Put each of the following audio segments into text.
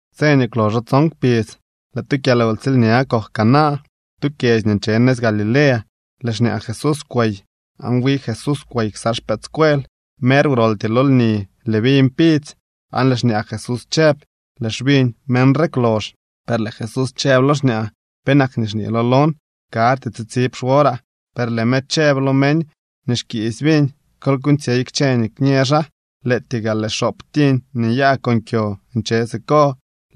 Tse nii kwloxo tson kpidz lëë tu kyalwtsiilña kok Caná, tu kyedzy nii nche nëz Galilea. Lëë xñaa Jesús kwey, aan wi Jesús kwey ksa xpëëdscuel. Mer wroltyee lo lni lëë viñ pidzy, aan lëë xñaa Jesús chëb: —Lëë xviñ meñ re kwlox. Per lëë Jesús chëb lo xñaa: —¿Penak nii xñeelo lon? Karty tsitsib xworaa. Per lëë me chëb lo meñ nii xkiisy viñ: —Kol kuuñtsyey kchë nii kñë xaa. Lëëtyee gaa lëë xoop tiñ nii nyaa con kyo nche siko.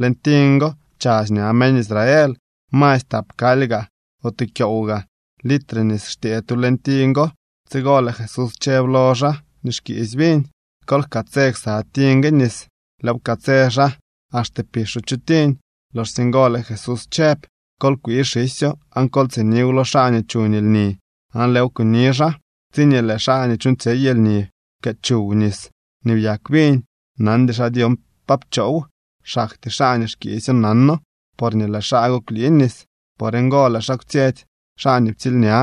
Leñ tiñ go chadx ña meñ Israel. Masy tap kaly gaa o tu kyoow gaa litre nis xtyëë tu leñ tiñ go. Tsigo lëë Jesús chëb lo xaa nii xkiisy viñ: —Kol jkatsë ksa tiñ gue nis. Lëëw pkatsë xaa axte pixo chu tiñ. Loxsye ngo lëë Jesús chëb: —Kol kwii xisyo aan kol tsiniw lo xaa nii chuñ lni. Aan lëëw kuni xaa. Tsiñee lëë xaa nii chuuñtsyey lni pkëë chuw nis nii byak viñ, nandy xaa dyon pa pchoow. Xaktyee xaa nii xkiisyo nano, porñee lëë xaa go kwlii nis. Por ngo lëë xaa kwtsyetsy xaa nii ptsiilña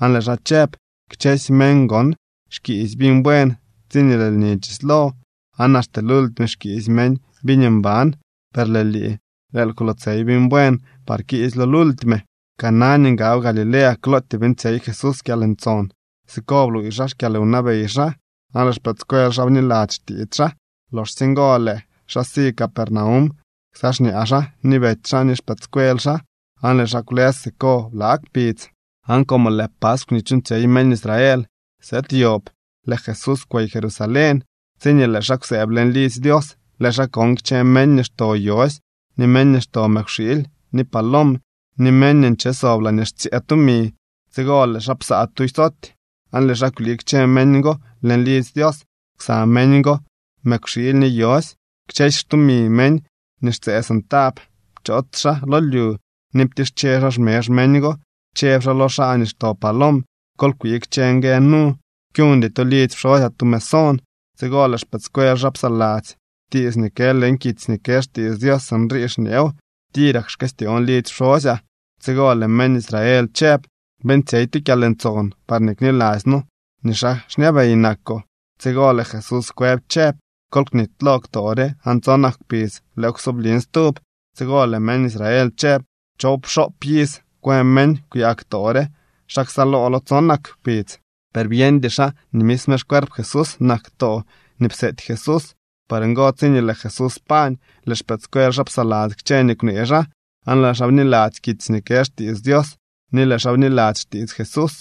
aan lëë xaa chëb: —Kchësy meñ gon xkiisy viñ buen tsiñee lëë lni chislo, aan axte lultime xkiisy meñ viñ mban, per lëë lii, lëël kwlootsey viñ buen par kiisylo lultime. Caná nii ngab Galilea klootyee beeñtsyey Jesús kyalntson. Siko bluuy xaa xkyalwnabey xaa, aan lëë xpëëdscuel xaa bniladzy xtiits xaa. Loxsye ngo lëë xaa si Capernaum ksa xñaa xaa ni betsy xaa ni xpëëdscuel xaa, aan lëë xaa kwlës siko bla kpidz. Aan como lëë paskw nii chuuñtsyey meñ Israel sëëd yob, lëë Jesús kwey Jerusalén. Tsiñee lëë xaa kwsëëb leñ lidzy Dios, lëë xaa kon kchë meñ nii xto yosy, ni meñ nii xto mëkwxiily ni palom, ni meñ nii nche sob laañee xtsyëë tumi. Tsigo lëë xaa psaa tu soty aan lëë xaa kwlii kchë meñ go leñ lidzy Dios ksa meñ go mëkwxiily ni yosy. Kchësy xtumi meñ nii xtsëë centab pchoots xaa lo lyu ni ptische xaa xmezh meñ go. Chëb xaa lo xaa nii xto palom: —¡Kol kwii kchë ngue nu! ¡Kyuñdy to lidzy pxosyaa tu mesón! Tsigo lëë xpëëdscuel xaa psaladzy tiits nii kë leñ kitsy nii kë xtiits Dios. Sinrii xñeew: “Tirak xkëstyoon lidzy pxosyaa.” Tsigo lëë meñ Israel chëb: —Beeñtsyey tu kyalntson parñee kniladzy noo nii xaa xñabey nakoo. Tsigo lëë Jesús kwëb chëb: —Kol knitylo ktoo re aan tsonak kpidz lëëw ksoblin stub. Tsigo lëë meñ Israel chëb: —Choowpxoop iz kwë meñ kwyaa ktoo re. ¿Xa ksaaloolo tsonak kpidz? Per byeñdy xaa nii misme xcuerp Jesús nak ktoo nii pseety Jesús. Por ngo, tsiñee lëë Jesús pañ, lëë xpëëdscuel xaa psaladzy kchë nii kwnee xaa, aan lëë xaa bniladzy kitsy nii kë xtiits Dios ni lëë xaa bniladzy xtiits Jesús.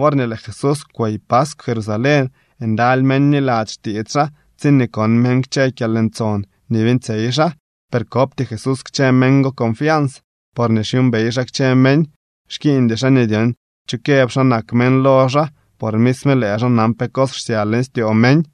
Worñee lëë Jesús kwey paskw Jerusalén, ndaly meñ bniladzy xtiits xaa tsiñee kon meñ kchë kyalntson nii beeñtsyey xaa. Per kopty Jesús kchë meñ go confians, porñee xyuumbey xaa kchë meñ. Xkiiñdy xaa nii dyon cho këb xa nak meñ lo xaa, por misme lëë xaa nan pe cos xsya leñ styoo meñ.